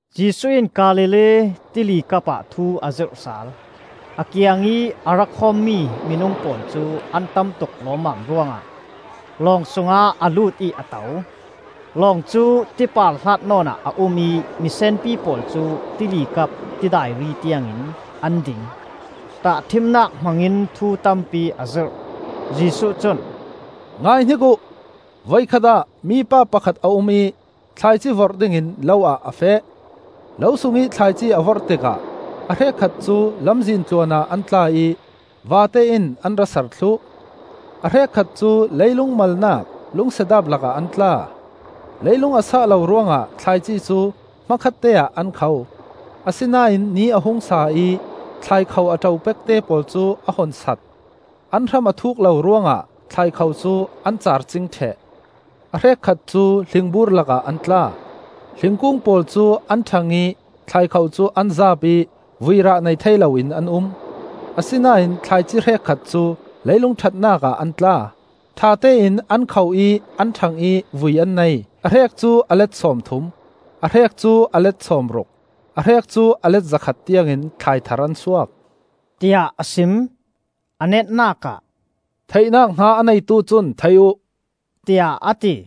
Jesuh in Galilee Tilikap ah thu a zirh sal. A kiangih a ra khawmmi minung pawl cu an tam tuk lawmmam ruangah lawng sungah a lut ih a to. Long cu tipar hlatnawn ah a um ih misenpi pawl cu tili kap tidai ri tiangin an ding. Tahṭhimnak hmangin thu tampi a zirh. Jesuh cun, “Ngaihnik uh: Voikhat ah mipa pakhat a um ih thlaici vorh dingin lo ah a feh. Lo sungih thlaici a vorh tikah a hrekkhat cu lamzin tluanah an tla ih vate in an ra sar thluh. A hrekkhat cu leilung malnak lungsedaap lakah an tla. Leilung a sah lo ruangah thlaici cu hmakhatte ah an kho. Asinain ni a hung sa ih thlaikho a ṭo pekte pawl cu a hun sat. An hram a thuk lo ruangah thlaikho cu an caar cing ṭheh. A hrekkhat cu hlingbur lakah an tla; hlingkung pawl cu an ṭhang ih thlaikho cu an zaap ih vuirah nei thei loin an um. Asinain thlaici hrekkhat cu leilung ṭhatnak ah an tla, ṭhatein an kho ih an ṭhang ih vui an nei. A hrek cu a let sawmthum, a hrek cu a let sawmruk, a hrek cu a let zakhat tiangin thlai thar an suak,” tiah a sim. A netnak ah, “Theihnak hna a neitu cun thei uh,” tiah a ti.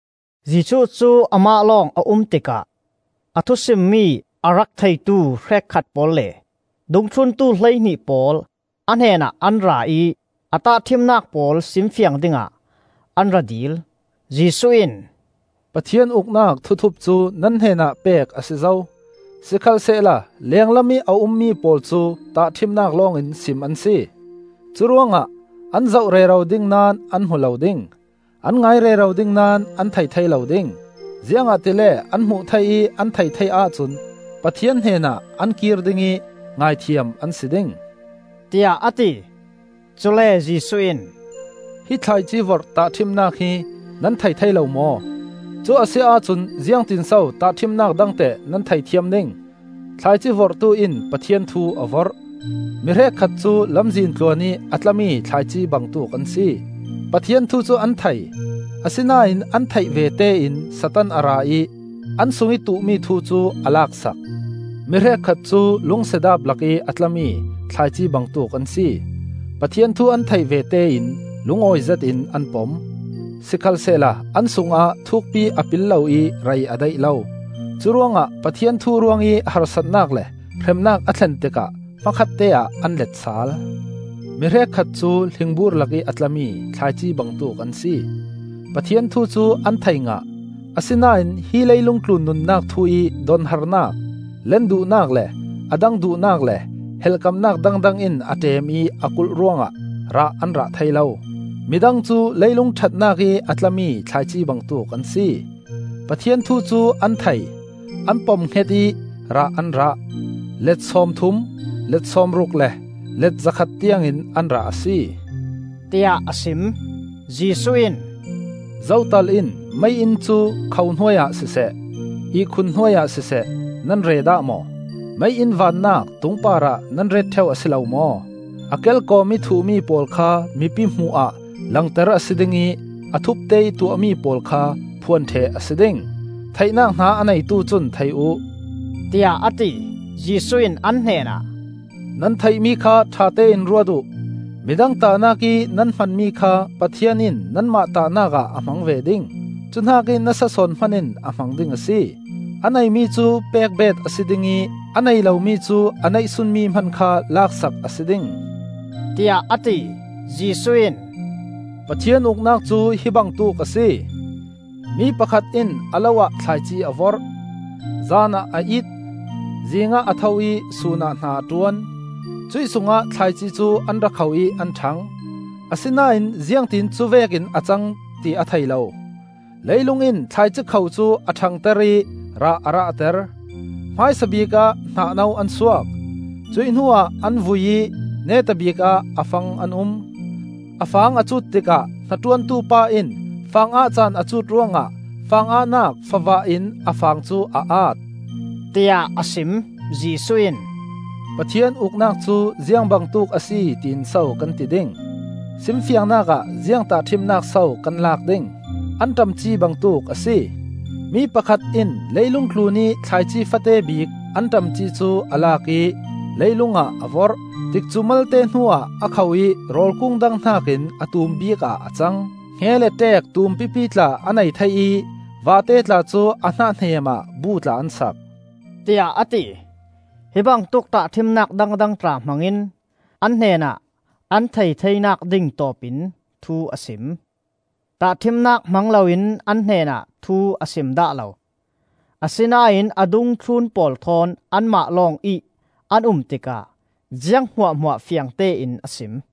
Jesuh cu amah lawng a um tikah a thusimmi a rak theitu hrekkhat pawl le dungthluntu hleihnih pawl a hnenah an ra ih a tahṭhimnak pawl simfiang dingah an ra dil. Jesuh in, “Pathian Uknak thuthup cu nan hnenah pek a si zo. Sikhalsehla lenglamih a ummi pawl cu tahṭhimnak lawng in sim an si; curuangah, ‘An zoh rero ding naón an hmu lo ding; An ngai rero ding naón an thei thei lo ding. Ziangahtile an hmuh thei ih an theih thei ahcun, Pathian hnenah an kir ding ih Ngaithiam an si ding,’,” tiah a ti. Cule Jesuh in, “Hi thlaici vorh tahṭhimnak hi nan thei thei lo maw? Cu a si ahcun ziangtinso tahṭhimnak dang teh nan theih thiam ding? Thlaici vorhtu in Pathian thu a vorh. Mi hrekkhat cu lamzin tluan ih a tlami thlaici bangtuk an si. Pathian thu cu an thei, asinain an theih vete in Satan a ra ih an sungih tuh mi thu cu a laksak. Mi hrekkhat cu lungsedaap lakih a tlami thlaici bangtuk an si. Pathian thu an theih vete in lungawi zetin an pom. Sikhalsehla an sungah thukpi a pil lo ih rei a daih lo. Cu ruangah Pathian thu ruangih harsatnak le hremnak a thlen tikah hmakhatte ah an leet sal. Mi hrekkhat cu hlingbur lakih a tla mi thlaici bangtuk an si. Pathian thu cu an thei ngah, asinain hi leilung tlun nunnak thu ih donharnak, len duhnak le a dang duhnak le helhkamnak dangdang in a ṭem ih a khuh ruangah rah an rah thei lo. Mi dang cu leilung ṭhatnak ih a tlami thlaici bangtuk an si. Pathian thu cu an thei, an pom hnget ih rah an rah. Let sawmthum, let sawmruk le let zakhat tiangin an rah a si,” tiah a sim. Jesuh in, “Zotal in mei-inn cu kho hnuai ah siseh, ihkhun hnuai ah siseh nan re dah maw? Mei-inn vannak tung parah nan ret ṭheu a si lo maw? A kelkawmih thuhmi pawl kha mipi hmuh ah langter a si ding ih a thupte ih tuahmi pawl kha phuan ṭheh a si ding. Theihnak hna a neitu cun thei uh,” tiah a ti. Jesuh in an hnenah, “Nan theihmi kha ṭhatein ruat uh. Midang tahnak ih nan hmanmi kha Pathian in nanmah tahnak ah a hmang ve ding, cu hnakih nasa sawn hman in a hmang ding a si. A neimi cu pek beet a si ding ih a nei lomi cu a neihsunmi hman kha lak sak a si ding,” tiah a ti. Jesuh in, “Pathian Uknak cu hi bangtuk a si. Mi pakhat in a lo ah thlaici a vorh. Zan ah a it, zingah a tho ih sunah hna a ṭuan, cuih sungah thlaici cu an rak kho ih an ṭhang. Asinain ziangtin cuvekin a cang, ti a thei lo. Leilung in thlaici kho cu a ṭhangter ih rah a rahter, hmaisabik ah hnah no an suak, cuih hnuah an vui ih neta bikah a fang an um. A fang a cut tikah hnaṭuantu pa in fang ah caan a cut ruangah fangahnak favah in a fang cu a at,” tiah a sim. Jesuh in, “Pathian Uknak cu ziang bangtuk a si tiin so kan ti ding? Simfiangnak ah ziang tahṭhimnak so kan lak ding? Anṭam ci bangtuk a si. Mi pakhat in leilung tlunih thlaici fate bik anṭam ci cu a lak ih leilung ah a vorh. Tikcu malte hnuah a kho ih rawl kung dang hnakin a tum bikah a cang. Hnge le ṭeek tumpipi tla a nei thei ih vate tla cu a hnah hneem ah bu tla an sak,” tiah a ti. Hi bangtuk tahṭhimnak dangdang tla hmangin an hnenah an theih theinak ding tawpin thu a sim. Tahṭhimnak hmang loin an hnenah thu a sim dah lo. Asinain a dungthlun pawl thawn anmah lawngih an um tikah ziang hmuahhmuah fiangtein a sim.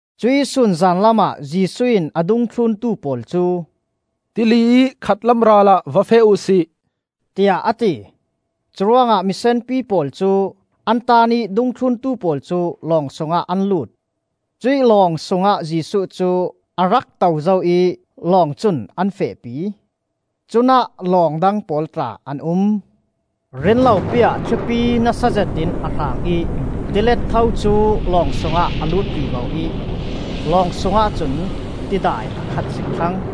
Cuih sun zanlam ah Jesuh in a dungthluntu pawl cu, “Tili ih khatlam ralah va feh uh si,” tiah a ti. Curuangah misenpi pawl cu an taan ih dungthluntu pawl cu lawng sungah an lut. Cuih lawng sungah Jesuh cu a rak to zo ih lawng cun an fehpi. Cunah lawng dang pawl tla an um. Rinlopi ah thlipi nasa zetin a hrang ih tilet tho cu lawng sungah a lut vivo ih lawng sungah cun tidai a khat zik thlang.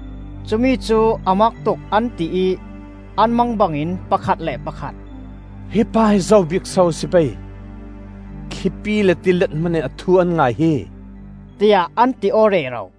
Cumi cu a mak tuk an ti ih an mang bangin pakhat le pakhat, “Hi pa hi zo bik so a si pei? Thlipi le tilet hmanin a thu an ngai hi!” tiah an ti aw rero.